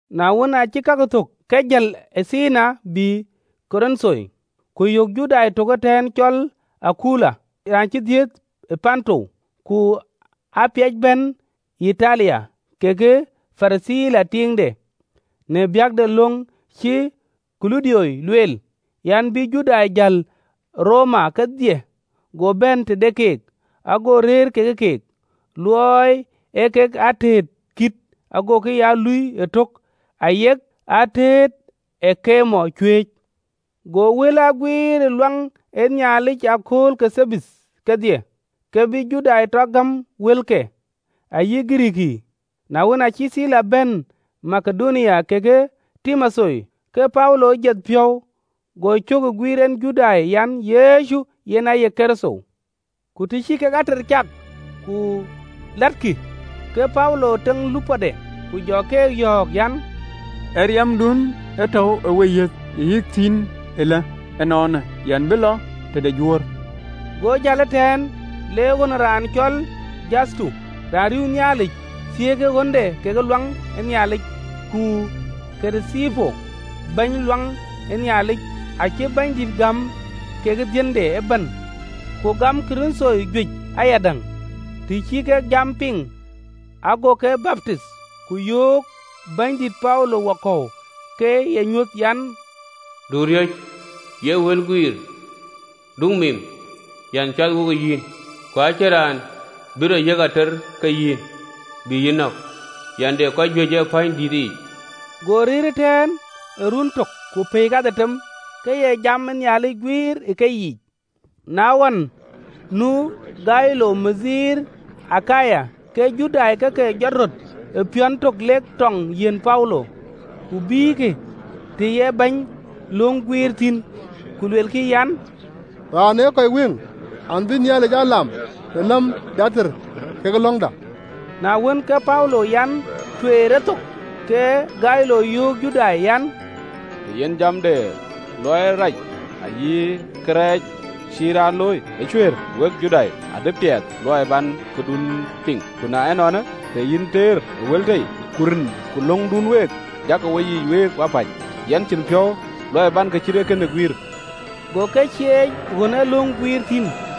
Na wën, aacï kakë thök, ke jël ë Athenai, bï Korinth. Ku yök Judai tök ëtɛ̈ɛ̈n cɔl Akula, raan cï dhiëëth ë Ponto, ku aa piɛc bɛ̈n ë Yitalia, kekë Pirithila tiiŋde, në biäk de löŋ cïï Kulaudio lueel an, bï Judai jäl ë Roma kedhie. Go bɛ̈n tëde keek, ago rëër ke keek, luɔi ee kek atëët kït, agokï ya luui ëtök, ayek atëët ee pɛɛny cuëëc. Go wël aa guiir luaŋ ë Nhialic ë akööl ke Thabath kedhie, ke bï Judai tɔ gäm wëlke, ayï Girikii. Na wën, aacï Thila bɛ̈n Makedonia kekë Timotheo, ke Paulo jieth piɔ̈u, go cök ë guïïr en Judai an, Yecu yen aye Kërtho. Ku të cï kek ater cak ku lɛ̈ɛ̈tkï, ke Paulo teŋ lupɔde, ku jɔ keek yɔ̈ɔ̈k an, “Ë riɛmdun tɔ̈u ë weyiëth, yɛn liu thïn, ëlë ënɔɔnë, yɛn bï lɔ tëde Juöör.” Go jäl ëtɛ̈ɛ̈n, le ɣön ë raan cɔl Tito Juthuto, raan riëëu Nhialic, thiëëkë ɣönde kekë luaŋ ë Nhialic. Ku Kirithipo, bɛ̈ny ë luaŋ ë Nhialic, acï Bɛ̈nydït gam kekë dhiënde ëbɛ̈n, ku gam Korinthoi juëc ayadäŋ, të cï kek jam piŋ, ago ke baptith. Ku yöök Bɛ̈nydït Paulo wakɔ̈u ke ee nyuöth an, “Du riɔ̈c, ye wël guiir, du mim, yɛn cath wo yïn, ku acïn raan bï rɔt yiëk ater ke yïn, bï yï nɔ̈k, yɛn de kɔc juëc ë pänydïïtëyic.” Go rëër ëtɛ̈ɛ̈n ë ruöön tök ku pɛ̈i kadhetem, ke ye jam ë Nhialic wɛ̈ɛ̈t në keyiic. Na ɣɔn, nu Galio ke ye bɛ̈ny de Akaya, ke Judai ke ke jɔt röt ë piɔ̈n tök lek tɔŋ yiɛ̈n Paulo, ku bïïkï të ye bäny löŋ guiir thïn. Ku luelkï an, “Raanë ee kɔc wëŋ an, bïk Nhialic aa lam në läm de ater kekë löŋda!” Na wën, ke Paulo an, tueer e thok, ke Galio yöök Judai an, “Tëë yen jam de luɔi rac ayï awäny cïï raan looi ë cuëër, wek Judai, adï piɛth luɔi bän këdun piŋ. Ku na ënɔɔnë, tëë yen ater ë wël tei, ku rin, ku löŋdun week, jakï woiyic week wapäc, yɛn cïn piɔ̈u luɔi bän kë cït ee kënë guiir!” Go ke cieec ɣön ee löŋ guiir thïn.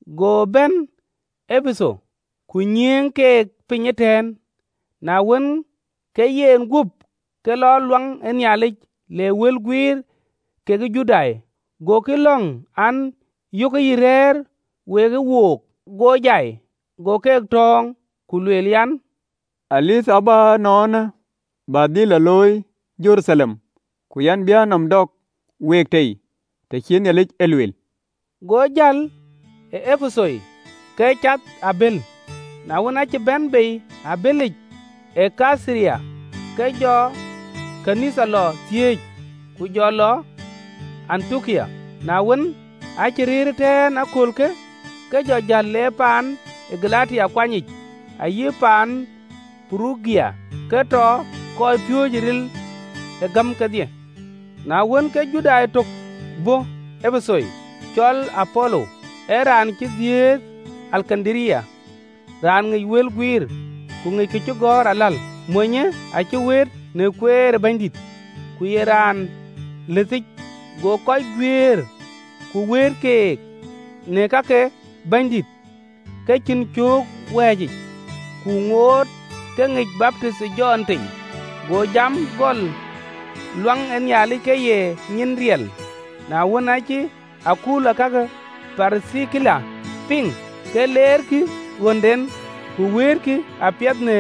Go bɛ̈n Epetho, ku nyiëëŋ keek piny ëtɛ̈ɛ̈n. Na wën, ke yenguöp ke lɔ luaŋ ë Nhialic, le wël guiir kekë Judai. Gokï lɔ̈ŋ an, yökë ke yï rɛ̈ɛ̈r wekë wook, go jäl. Go keek tɔ̈ɔ̈ŋ, ku lueel an, Dhuëëŋ abɔ̈ ënɔɔnë abä dhil lɔ looi Jeruthalem, ku yɛn bï a nɔm dɔ̈k week tei, të cï Nhialic e lueel. Go jäl ë Epetho ke cath ë abël. Na wën, aacï bɛ̈n bei ë abëlic ë Kaitharia, ke jɔ ɣön ë Nhialic lɔ thiëëc, ku jɔ lɔ Antiokia. Na wën, aacï rëër ëtɛ̈ɛ̈n ë aköölkë, ke jɔ jäl, le piny ë Galatia kuanyic, ayï paan ë Purugia, ke tɔ kɔcpiööcë ril ë gäm kedhie. Na wën, ke Judai tök bɔ̈ Epetho, cɔl Apolo, ee raan cï dhiëëth ë Alekandaria, raan ŋic wël guiir, ku ŋic kacïgɔ̈ɔ̈r aläl. Monyë acï wëët në kueer ë Bɛ̈nydït, ku ye raan lëthic, go kɔc guiëër ku wëët keek në ka ke Bɛ̈nydït ke cïn cöök wɛ̈ɛ̈c, ku ŋoot ke ŋic baptith ë Jɔn tei. Go jam gɔl luaŋ ë Nhialic ke ye nyin riɛl. Na wën, acï Akula kekë Pirithila e piŋ, ke leerkï ɣönden, ku wëëtkï apiɛth në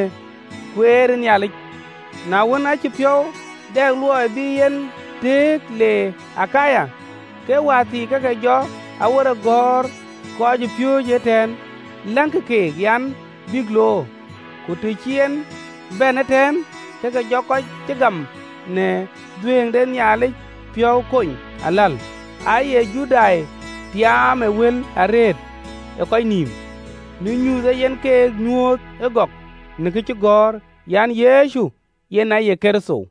kueer ë Nhialic. Na wën, aacï piɔ̈u dɛ luɔi bï en tëëk le Akaya, ke wäthii ke ke jɔ awerek gäär kɔcpiööcë ëtɛ̈ɛ̈n, läŋkï keek an, bïk loor, ku të cï en bɛ̈n ëtɛ̈ɛ̈n, ke jɔ kɔc cï gam në dhuëëŋ de Nhialic piɔ̈u kony aläl. Aaye Judai tiaam ë wël arëët ë kɔc nïïm, në nyuuth ee yen keek nyuööth ë gɔk në kacïgɔ̈ɔ̈r, an, Yecu yen aye Kërtho.